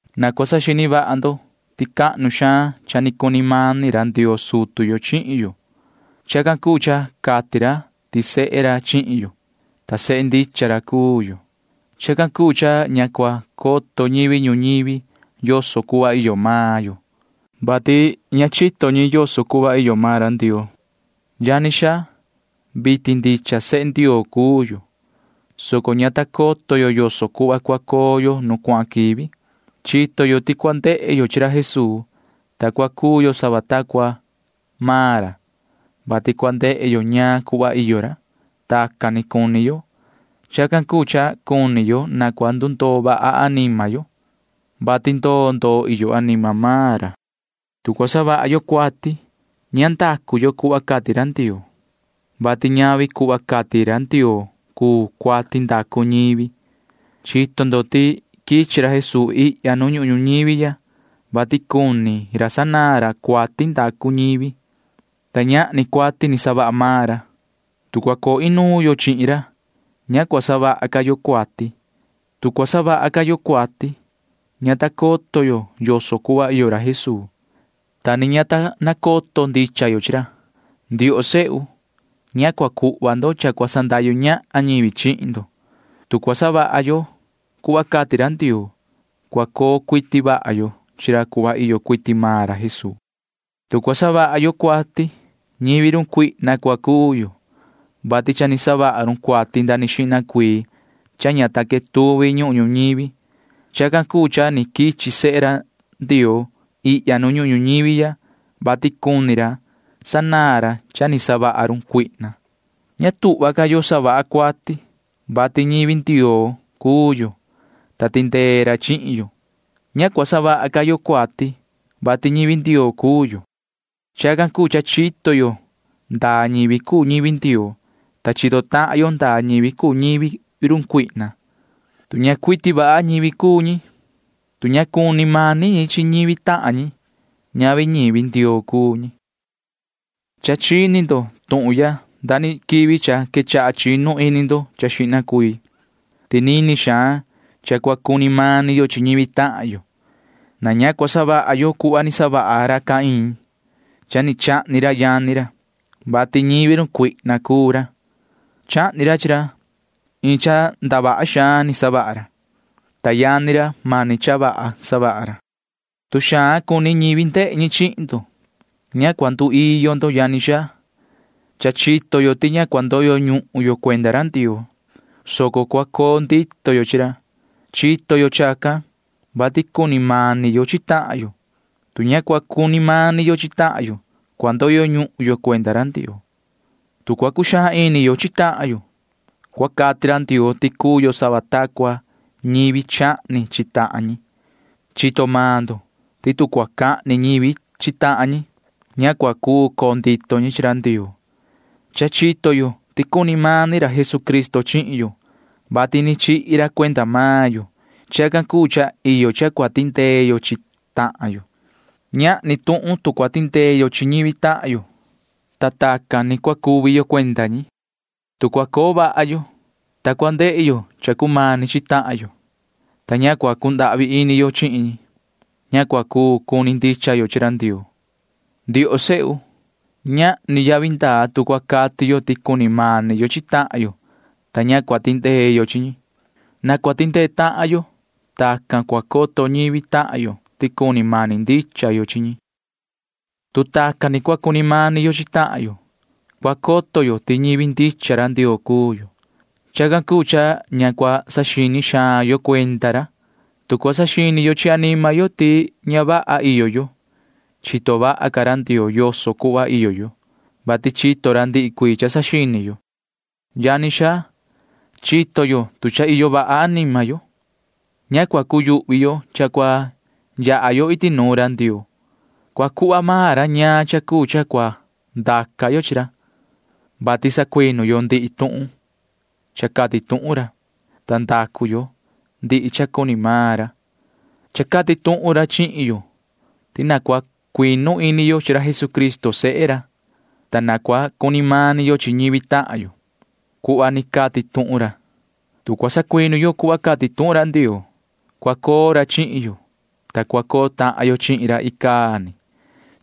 Na cua saxini vaha ndo ti cuaha xaan cha ni cuni mani ra Ndioo sutu yo chihin yo. Chacan cuu cha cati ra ti sehe ra chihin yo, ta sehe ndicha ra cuu yo. Chacan cuu cha ña cua coto ñivi ñuñivi yoso cuhva iyo maan yo, vati ña ni chito ñi yoso cuhva iyo maan ra Ndioo. Yani xaa, vitin ndicha sehe Ndioo cuu yo, soco ña ta coto yo yoso cuhva cua coo yo nu cuahan quivi. Chito yo ti cua ndehe yo chi ra Jesuu, ta cua cuu yo sava ta cua maan ra, vati cua ndehe yo ñaan cuhva iyo ra. Tacan ni cuni yo. Chacan cuu cha cuni yo na cua ndundoo vaha anima yo, vati ndoo ndoo iyo anima maan ra. Tu cua savaha yo cuati, ña cua savaha yo cuhva cati ra Ndioo, vati ñavi cuhva cati ra Ndioo cuu cuati ndacu ñivi. Chito ndo ti quichi ra Jesuu ihya nu ñuhun ñuñivi ya, vati cuni sanaan ra cuati ndacu ñivi, ta ñahni cuati ni savaha maan ra. Tu cua coo inuun yo chihin ra, ña cua savaha ca yo cuati. Tu cua savaha ca yo cuati, ña ta coto yo yoso cuhva iyo ra Jesuu, ta ni ña ta nacoto ndicha yo chihin ra. Ndioho sehu, ña cua cuhva ndo cha cua sandahyu ñahan ñivi chihin ndo. Tu cua savaha yo cuhva cati ra Ndioo, cua coo cuiti vaha yo chi ra cuhva ni iyo cuiti vaha maan ra Jesuu. Tu cua savaha yo cuati, ñivi run cuihna cua cuu yo, vati cha ni savaha run cuati nda ni quivi xihna cuii cha ña ta quetuvi ñuhun ñuñivi. Chacan cuu cha ni quichi ra sehe Ndioo ihya nu ñuhun ñuñivi ya, vati cuni ra sanaan ra cha ni savaha run cuihna. Ña tuhva ca yo savaha yo cuati, vati ñivi Ndioo cuu yo, ta tindee ra chihin yo. Ña cuu ca savaha yo cuati, vati ñivi Ndioo cuu yo. Chacan cuu cha chito yo ndaa ñivi cuu ñivi Ndioo, ta chito tahan yo ndaa ñivi cuu ñivi run cuihna. Tu ña cuiti vaha ñivi cuu ñi, tu ña cuni mani ñi chi ñivi tahan ñi, ñavi ñivi Ndioo cuu ñi. Cha chini tuhun ndo quivi cha quechaha chinu ini ndo xihna cuii ti nini xaan cha cua cuni mani yo chi ñivi tahan yo. Na ña cua savaha yo cuhva ni savaha ra Caín. Cha ni chahni ra yani ra, vati ñivi run cuihna cuu ra. Chahni ra chi ra, vati mani cha ndavaha ni savaha ra, ta mani cha vaha ni savaha yani ra. Tu xaan cuni ñivi ndehe ñi chihin ndo, ña cua nduiyo ndo, yani xaa. Cha chito yo ti ña cua ndoyo ñuhun yo cuenda ra Ndioo, soco cua coo ndito yo chi ra. Chacan ni chito yo, vati cuni mani yo chi tahan yo. Tu ña cua cuni mani yo chi tahan yo, cua ndoyo ñuhun yo cuenda ra Ndioo. Tu cua cuxaan ini yo chi tahan yo, cua cati ra Ndioo ti cuu yo sava ta cua ñivi chahni chi tahan ñi. Chito maan ndo ti tu cua cahni ñivi chi tahan ñi, ña cua cuu coo ndito ñi chi ra Ndioo. Cha chito yo ti cuni mani ra Jesucristo chihin yo, vati ni chihi ra cuenda maan yo. Chacan cuu cha iyo cha cua tindee yo chi tahan yo. Ñahni tuhun tu cua tindee yo chi ñivi tahan yo, ta tacan ni cua cuvi yo cuenda ñi. Tu cua coo vaha yo, ta cua ndehe yo cha cumani chi tahan yo, ta ña cua cundahvi ini yo chihin ñi, ña cua cuu cuni ndicha yo chi ra Ndioo. Ndioho sehu, ñahni yavi ndaa tu cua cati yo ti cuni mani yo chi tahan yo, ta ña cua tindee yo chi ñi. Na cua tindee tahan yo chi ñi. Tacan ni cua coto ñivi tahan yo ti cuni mani ndicha yo chi ñi. Tu tacan ni cua cuni mani yo chi tahan yo, cua coto yo ti ndicha ñivi Ndioo cuu yo. Chacan cuu cha ña cua saxini xaan yo cuenda ra. Tu cua saxini yo chi anima yo ti ña vaha yo, cua coto vaha xaan ca ra Ndioo yoso cuhva iyo yo, vati chito maan ra ndihi cuii cha saxini yo. Yani xaa, tu cua coto yo chi anima yo ti cha iyo vaha yo, ña cua cuyuhvi yo cha cua yaha yo iti nuun ra Ndioo. Cua cuhva maan ra ñaan cha cuu cha cua ndaca yo chihin ra, vati sacuinu yo ndihi tuhun cha cati tuhun ra, ta ndacu yo ndihi cha cuni maan ra. Cha cati tuhun ra chihin yo ti na cua cuinu ini yo chi ra Jesucristo sehe ra, ta na cua cuni mani yo chi ñivi tahan yo cuhva ni cati tuhun ra. Tu cua sacuinu yo cuhva cati tuhun ra Ndioo, cua coo ra chihin yo, ta cua coo tahan yo chihin ra icaa ni.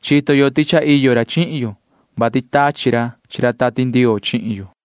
Chito yo ti cha iyo ra chihin yo, vati tachi ra chi ra Tati Ndioo chihin yo.